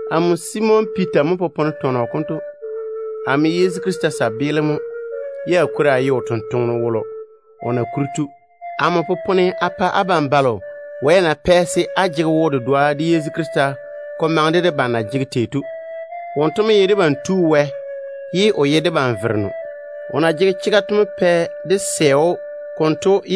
Amo Simon Piita mo popone tɔnɔ konto. Amo ye Yezu Krista kabaa mo, ye a kwori a ye o totoŋa nakwe. Amo popone a pa abam balo Wɛ na pɛ se á jege wo-dedoa de Yezu Krista, ko maŋe de debam de na jege tei ye ko jege lonne ko pae debam to. Wonto mo ye debam Tu Wɛ, ye o ta ye debam Vereno. O na yɔɔre o zege o chega wone to mo pɛ dé sɛ‑o konto.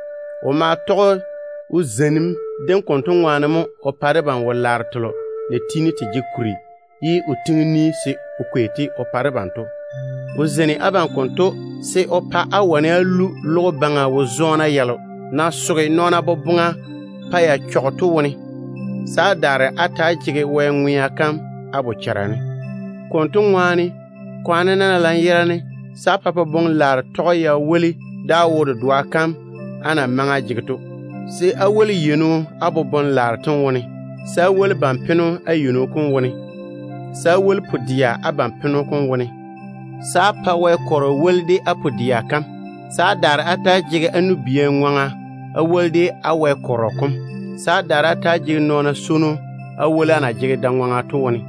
O ma tɔge o zeinim dem konto baŋa ne mo o pa debam wo-laaro telo na tiini te jege kuri ye o pwooli se o kwei-te o pa debam to. O zeini abam konto se o pa á wane á lu logo baŋa wo-zɔɔna yalo na soge nɔɔna boboŋa pa ya chɔge to wone, se á daare á ta‑á jege Wɛ ŋwea kam á bochara ne. Konto ŋwaane, kwaane-na lanyerane se á pa nɔn-ŋonne tɔge de woli de á wo-dedoa kam á na maŋe á jege to, se á woli yeino á nɔn-ŋonne dem wone, se á woli ban-peno á yeino kom wone, se á woli pu-dɛa á ban-peno kom wone, se á pa Wɛ kɔrɔ woli de á pu-dɛa kam, se á daare á ta‑á jege á nu-bia ŋwaŋa á woli de á Wɛ kɔrɔ kom, se á daare á ta‑á jege nɔɔna swono á woli á na jege da-ŋwaŋa to wone.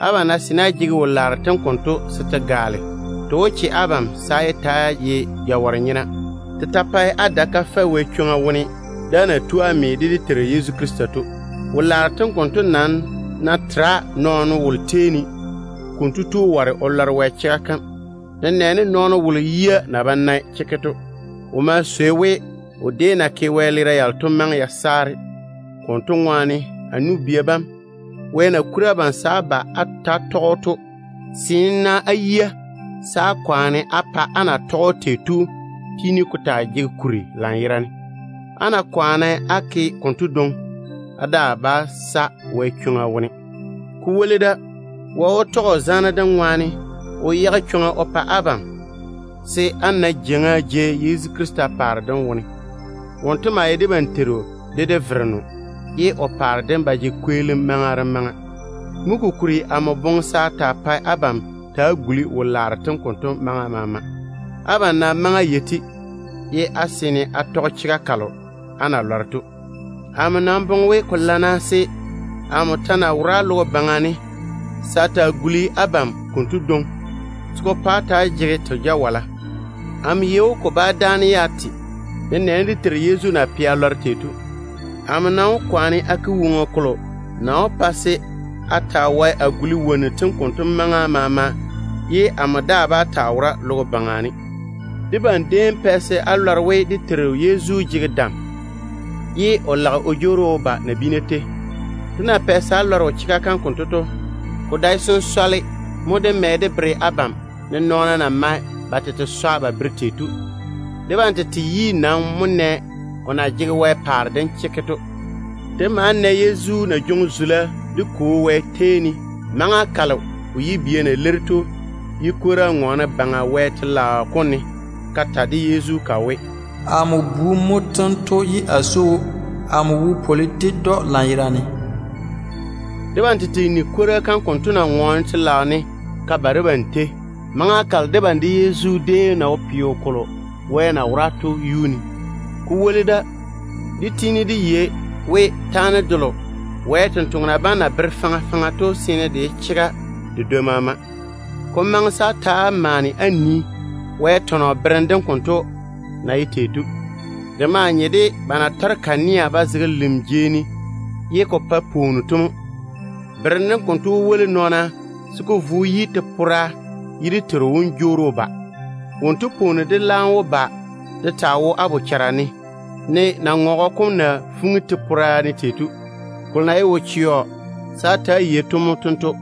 Abam ná seene á jege wo-laaro tem konto se te gaale, te wó che abam se á yé ta‑á ye jawɔre-nyena. Te ta pae á dae kafɛ Wɛ chwoŋa wone de á na tu á lɔre dé Teiru Yezu Krista chega kam to. Wo-laaro tem konto nam ná tera nɔɔno wolo tei ne, konto tu ware o lɔre Wɛ chega kam, nenɛɛne nɔɔno wolo yia na ba nae chekke to. O ma swei we, o déem na ke wɛleera yalo to maŋe ya saare. Konto ŋwaane, a nu-bia bam, Wɛ na bwoŋi abam se á ba á ta‑á tɔge‑o to, seene-na á yia se á kwaane se ko pa á na tɔge‑o tei to tiini ko ja kuri lanyerane. Á ná kwaane á ke konto dwoŋi, á daa bá sa Wɛ chwoŋa wone. Ko woli da, Wɛ wó tɔge o zaane dem ŋwaane o yage chwoŋa o pa abam se á na jeiŋa jei Yezu Krista paare dem wone. Wonto maa ye dé Teiru de dé Vereno, ye o paare dem ba jege kweelim maŋa de maŋa. Mo kokuri amo boŋe se a taa pae abam ta‑á guli wo-laaro tem konto gula maŋa maama. Abam nam maŋe á yei-te, ye á seene á tɔge chega kalo á na lɔre to. Amo nam boŋe we ko lana se, amo ta ná wora logo baŋa ne, se a taa guli abam konto dwoŋi, se ko pa á ta‑á jege te jawala. Amo yei we ko bá dáane ye a te, nenɛɛne dé Teiru Yezu Krista na pɛ a lɔre tei to. Amo nam wó kwaane a ke woŋo kolo na wó pa se á ta‑á wae á guli wonnu tem konto gula maŋa maama ye amo daa bá taa wora logo baŋa ne. Debam déem pɛ se á lɔre chega kalo na vei dé Teiru Yezu dam dem seeni de o tutuuri dem seeni to. Dé na pɛ se á lɔre o chega kam konto to, ko dae sensɔle mo dé mɛ dé bere abam, ne nɔɔna na mae ba tete swa ba bere tei to. Debam tete yi nam mo nɛ Yezu na jege Wɛ paare dem chekke to. Dé ma na o na jwoŋi zula dé Kwo Wɛ tei ne maŋa kalo kwora na ŋɔɔne Baŋa Wɛ paare jeiga kam ne ka ta ded‑o ka we: “Amo Bu mo tento ye a swoi‑o. O kikia su amo yi.” Debam tete nigi kwora kam konto na ŋɔɔne telaao ne ka ba debam tei, maŋa kalo debam de Yezu déem na wo peo kolo Wɛ na pɔɔre o pa o tete to yuu ne. Ko woli da, dé yɔɔre dé yei we, taane delo Wɛ sampwori sem na bere faŋa faŋa to seene de ye chega de dwoi maama. Ko maŋe se á ta‑á maane á nii Wɛ tɔnɔ berem dem na ye tei ye de nye de kanea ba na tɔre ba zege lim jei ne ye ka pae pwooni to mo. Berem dem konto wó woli nɔɔna se ko vo ko yi te-pora ye dé Teiru wom jwoori o ba. Wonto pwooni dem laam wó ba de taa wo á bochara ne, ne naŋɔgɔ na fuŋi te-pora ne tei to. Kolo na ye wo-chɛɔ se á ta‑á yei to mo tento: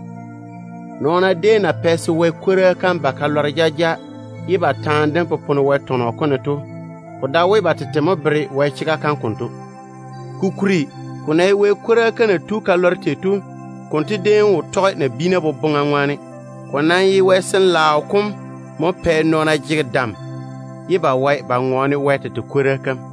Nɔɔna déem na pɛ se Wɛ kwora kam ba ka lɔre jaja ye ba taane dem popone Wɛ tɔnɔ kom ne to, ko dae we ba tete mo bere Wɛ chega kam konto. Kokuri, ko ná ye Wɛ kwora kam na tu ka lɔre tei to, konto déem wo tɔge de nabiina boboŋa na lage tei. Ko nam ye Wɛ Sin-laao kom mo zeini nɔɔna pa ba wae ba ŋɔɔne Wɛ tete kwora kam.